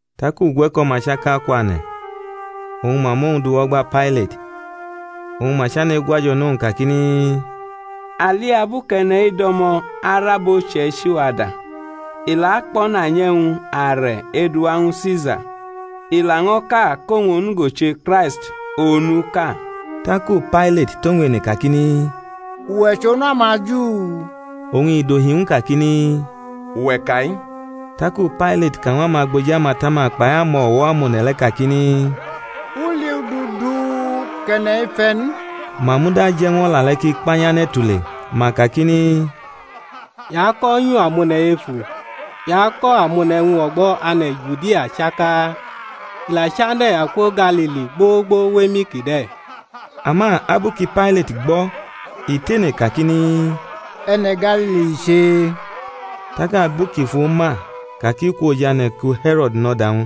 Tak ugwe̩ko̩-ma chaka kwane̩, oñ ma mʼowñ du wʼo̩gba Pailat. Oñ ma chane̩ egwajo̩ nʼowñ kakini, A li abu kʼe̩ne̩-i do̩mo̩ arʼabo uche̩ichi-wa da, i la akpo̩nanyʼe̩wñ-are̩ edu ñwu Sisa, i laño̩ ka kʼowñ onugo che Kraist onuʼka. Taku Pailat tʼowñ ene kakini, Uwe̩ chʼOnu amaJu? Oñ i dohi ñw u kakini, Uwe̩ ka-i. Taku Pailat ka ñw amagboji amatama kpai amo̩wo̩ amone̩ le̩ kakini, U li udu du kʼe̩ne̩-i fe̩ n. Ma muda je̩ ñw o̩la le̩ kʼi kpanyane̩ tule; ma kakini, I ako̩nyu amone̩ efu, i ako̩ amone̩ e̩wñ o̩gbo̩ ane̩ Judia chaka, i la chane̩ akwo Galili gbogbo wʼemi kide̩. Ama abu ku Pailat gbʼo̩, i tene kakini, E̩ne̩ Galili i che? Tak abu kʼi fu ma ka kʼi kwʼojane̩ ku He̩ro̩d nʼo̩da-wñ,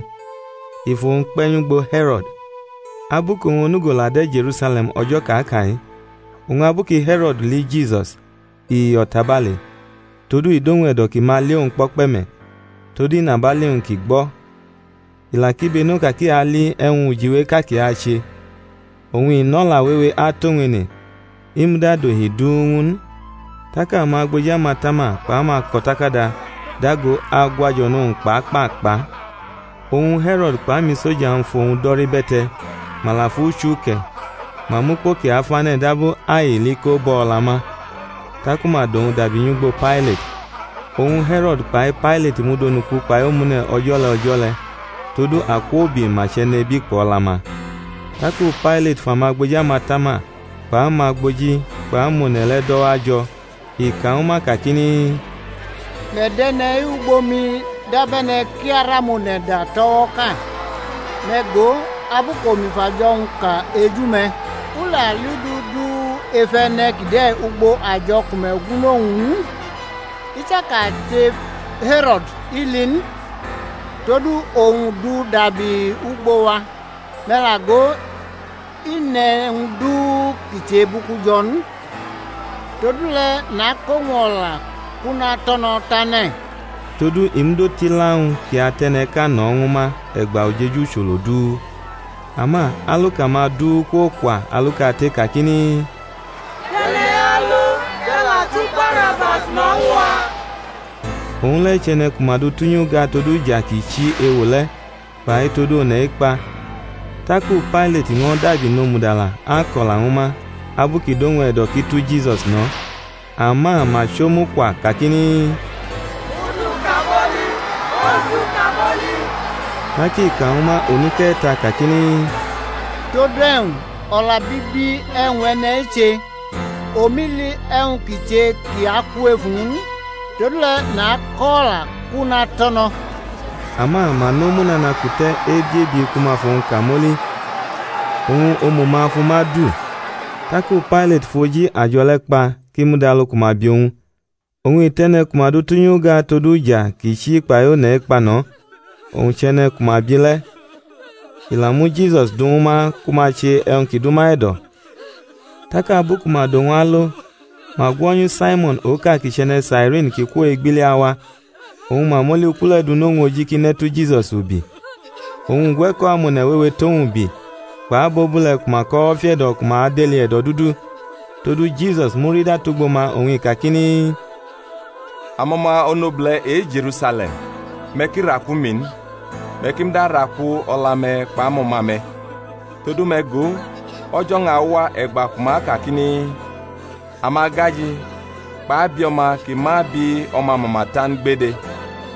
i fʼowñ kpe̩ nyʼugbo He̩ro̩d, abu kʼowñ onugo la de̩ Je̩rusale̩m o̩jo̩ kʼa ka-i. Oñ abu ku He̩ro̩d li Jisus, i yo̩ tabale; todu i dʼowñ e̩do̩ ki ma li owñ kpo̩kpe̩ me̩ tod inabali-wñ kʼi gbo̩; i la kibeno ka kʼi ali e̩wñ ujiweʼka kʼi ache. Oñ i nʼo̩la wewe atʼowñ ene; i muda dʼohi du ñw u n. Tak amagboji amatama kpʼamako̩takada dago agwajo̩ nʼowñ kpa kpa kpa. Oñ He̩ro̩d kpʼamisoja-wñ fʼowñ do̩rʼibe̩te̩, ma la fʼu chuke̩, ma mʼukpo ki afane̩ dab aili ko bʼo̩ o̩la ma, taku ma dʼowñ dabi nyʼugbo Pailat. Oñ He̩ro̩d kpai Pailat mud onuku kpai omune̩ o̩jo̩ le̩ o̩jo̩ le̩: todu akwoubi ma chʼe̩nebi kpʼo̩la-ma. Taku Pailat fʼamagboji amatama kpʼamagboji kpʼamone̩ le̩ do̩wajo̩, i ka ñwu ma kakini, Me̩ dʼe̩ne̩-i wʼugbo mi dab e̩ne̩ kʼi arʼamone̩ da tʼo̩wo̩ʼka: me̩ go, abu kʼomi fʼajo̩-wñ ka eju me̩, u la li udu du ef e̩ne̩ kide̩ ugbo ajo̩ ku me̩ gwunʼowñ n; i chaka che He̩ro̩d, i li n: todu owñ dʼu dabi wʼugbo wa; me̩ la go, i ne̩ e̩wñ du kʼi che bʼuku jo̩ n. Todule̩ nakʼowñ o̩la kʼu natʼo̩ no̩ tane̩. [ Todu I mud otila ñw u kʼi atʼe̩ne̩ʼka no̩ ñwu ma e̩gba ujeju ucholo du.] Ama aluka-ma du kwokwa alukate kakini, Dʼe̩ne̩-i alo, kʼe̩ la tu Barabas no̩ ñw a: owñ le̩ chʼe̩ne̩ ku ma du tʼunyi uga tod uja ki chi ewo le̩ kpai tod one̩ ekpa. Taku Pailat ño̩ dabi nomudala ako̩la ñwu ma, abu ki dʼowñ e̩do̩ kʼi tu Jisus no̩; ama ma chʼomu kwa kakini, Mʼu du kamoli, mʼowñ du kamoli. Tak i ka ñw ma onuke̩ta kakini, Todu e̩wñ? o̩la bibi e̩wñ e̩ne̩-i che? Omi li e̩wñ kʼi che kʼi aku ef uwñ n: todule̩ nakʼo̩ o̩la, kʼu natʼo̩ no̩. Ama ma nʼomu nana kute̩ ebi-ebi ku ma fʼowñ kamoli. Oñ omu-ma fʼuma du. Taku Pailat fʼoji ajo̩ le̩ kpa kʼi mud alu ku ma bi owñ. Oñ i tʼe̩ne̩ ku ma du tʼunyi uga tod uja ki chi kpai one̩ ekpa no̩, owñ chʼe̩ne̩ ku ma bi le̩; i la mu Jisusi du ñw ma ku ma che e̩wñ ki dʼuma e̩do̩. Tak abu ku ma dʼowñ alo, ma gwo̩nyu Saimo̩n oka kʼi chʼe̩ne̩ Sairini kʼi kwo egbili awa, oñ ma mʼoli uku le̩ du nʼowñ oji kʼi ne̩ tu Jisus ubi. Oñ ugwe̩ko̩ amone̩ wewe tʼowñ ubi, kpʼabobule̩ ku ma kʼo̩wo̩ fiʼe̩do̩ ku ma deli e̩do̩dudu. Todu Jisusi murida tugbo ma oñ i kakini, Amo̩ma onobule̩ e-Je̩rusale̩m, me̩ ki raku mi n, me̩ ki muda raku o̩la-me̩ kpʼamo̩ma-me̩. Todu, me̩ go, o̩jo̩-wñ awa e̩gba ku ma akakini, Amagaji, kpʼabio̩ma ki ma bi o̩ma mama ta n gbede,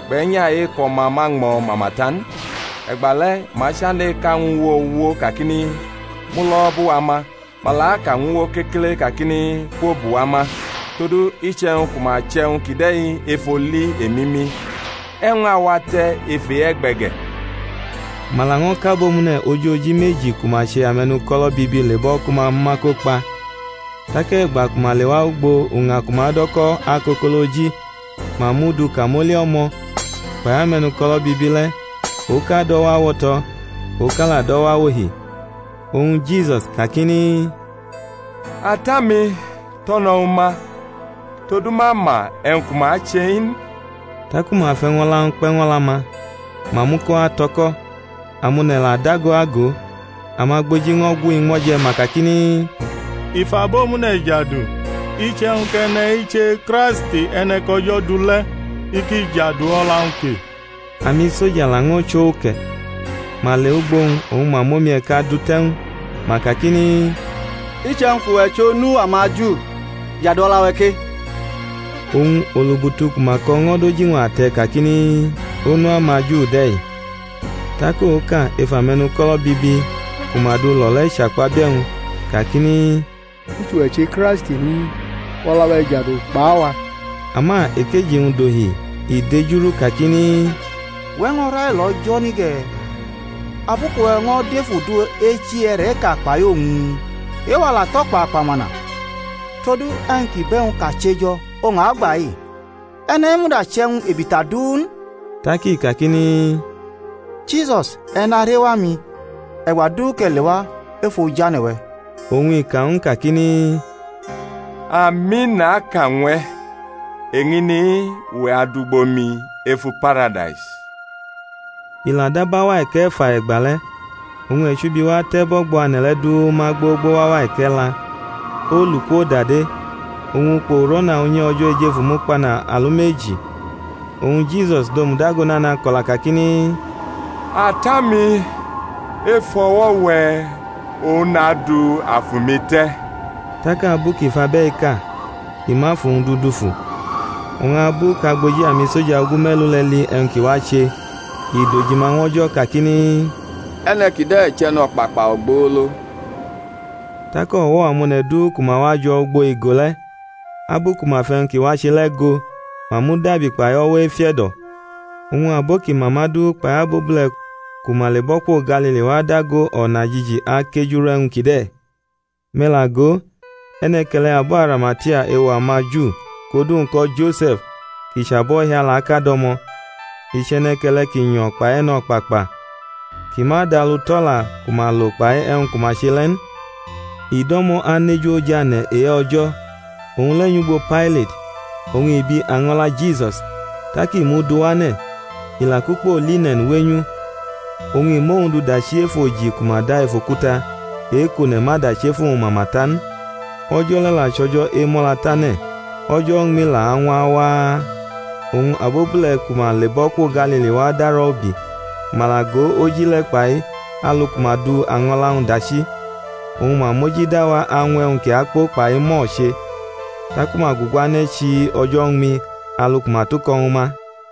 kpʼe̩nya e-kʼo̩ma ma ñmo̩ mama ta n. E̩gbale̩ ma achane̩ eka ñw uwo, uwo, kakini, Mulo̩ bʼuwa ma; ma la aka ñw uwo kekele kakini, Kwobʼuwa ma. Todu iche̩wñ ku ma chʼe̩wñ kide̩ ef oli emimi, e̩wñ awate̩ ef e-e̩gbe̩ ge̩? Ma laño̩ kʼabomune̩ ojoji meji ku ma che ame̩nuko̩lo̩ bibi lebʼo̩ ku ma mʼuma ko kpa. Tak e̩gba ku ma lewa ugbo uña ku ma do̩ ko̩ Akokoloji, ma mʼu du kamoli o̩mo̩, kpai ame̩nuko̩lo̩ bibi le̩, oka dʼo̩wo̩ awo̩to̩, oka la dʼo̩wo̩ awohi. Oñ Jisus kakini, Ata-mi, to̩no̩ ñwu ma, todu ma ma e̩wñ ku ma ache-i n. Taku ma fʼe̩wñ o̩la-wñ kpe̩ ñw o̩la-ma, ma muko ato̩ko̩. Amone̩ la dago ago. Amagboji ño̩ gwʼu iñmo̩ je̩, ma kakini, I fʼabomune̩ jadu, iche̩wñ kʼe̩ne̩-i che Kraist e̩ne̩ kʼO̩jo̩ du le̩ i ki jadu o̩la-wñ ke. Amisoja laño̩ chʼo uke̩, ma lewʼugbo-wñ, oñ ma mʼomi-e̩ka du te̩ ñw u, ma kakini, Iche̩wñ kʼuwe̩ chʼOnu amaju, jadu o̩la-we̩ ke. Oñ olubutu ku ma ko̩ ño̩ dʼoji-wñ ate̩ kakini, Onu amaJu de̩-i. Tak oka ef ame̩nuko̩lo̩ bibi ku ma du lo̩ le̩ chakpabie̩ owñ kakini, I chʼuwe̩ che Kraisti n? Fʼo̩la-we̩ jadu kpʼawa. Ama ekeji-wñ dohi, i dejurʼu kakini, Uwe̩ ño̩ railo O̩jo̩ ni ge̩, abu kʼuwe̩ ño̩ dʼef udu echi e̩re̩ʼka kpai owñ? E-wa la tʼo̩kpakpa mana, todu e̩wñ kʼi bʼe̩wñ kʼa che jo̩ oñ a gba-i: e̩ne̩-i muda chʼe̩wñ ebita du n. Tak i kakini, Jisus, e̩ narewa mi e̩gba du kʼe̩ lewa ef ojane̩-we̩. Oñ i ka ñw u kakini, Ami naka ñw e̩, eñini-i uwe̩ adʼugbo mi efu Paradais. I la dab auwa e̩ke̩fa e̩gbale̩, oñ e̩chubi wa te̩ bʼo̩gbo ane̩ le̩ du ma gbogbo wʼauwa e̩ke̩la; olu kwodade, oñ ukpo uro̩na unyi O̩jo̩ ejefu mukpana alumeji. Oñ Jisus dʼomu dago nana ko̩la kakini, Ata-mi, ef o̩wo̩-we̩ oñ nadu afu-mi te̩; tak abu kʼi fʼabe̩-i ka, i mʼafu-wñ du dufu. Oñ abu kʼagboji amisoja ogume̩lu le̩ li e̩wñ ki wache, i dʼojima ñw O̩jo̩ kakini, E̩ne̩ kide̩ chʼe̩no̩kpakpa ogbolo. Tak o̩wo̩-amone̩ du ku ma wajo̩ ugbo igo le̩, abu ku ma fʼe̩wñ ki wache le̩ go, ma mudabi kpai o̩wo̩ efiʼe̩do̩. Oñ abo kʼi ma ma du kpai abobule̩ ku ma lebʼo̩ kwo Galili wa dago o̩najiji akejuru e̩wñ kide̩. Me̩ la go, e̩ne̩ke̩le̩ abo Arimatia, ewo amaJu kʼodu-wñ ko̩ Jose̩f, kʼi chʼabohialaʼka do̩mo̩. I chʼe̩ne̩ke̩le̩ ki nyo̩ kpai e̩no̩kpakpa, kʼi ma dʼalu tʼo̩la ku ma lo kpai e̩wñ ku ma che le̩ n. I do̩mo̩ aneju ojane̩ e-O̩jo̩. Owñ le̩ nyʼugbo Pailat, oñ i bi año̩la Jisus. Tak i mʼu du wane̩, i la kʼukpo line̩n wenyʼu, oñ i mʼowñ du dachi ef oji ku ma da ef okuta, e-kʼone̩ ma dachi efu-wñ mama ta n. O̩jo̩ le̩ la chʼO̩jo̩ Emo̩latane̩ o̩jo̩ uñmi la añwa waa. Oñ abobule̩ ku ma lebʼo̩ kwo Galili wa darʼo̩ ubi, ma la go oji le̩ kpai alu ku ma du año̩la-wñ dachi. Oñ ma mojida wa añwʼe̩wñ ki akpo kpai mur che. Taku ma guguane̩ chii o̩jo̩ uñmi alu ku ma tʼuko̩ ñwu ma.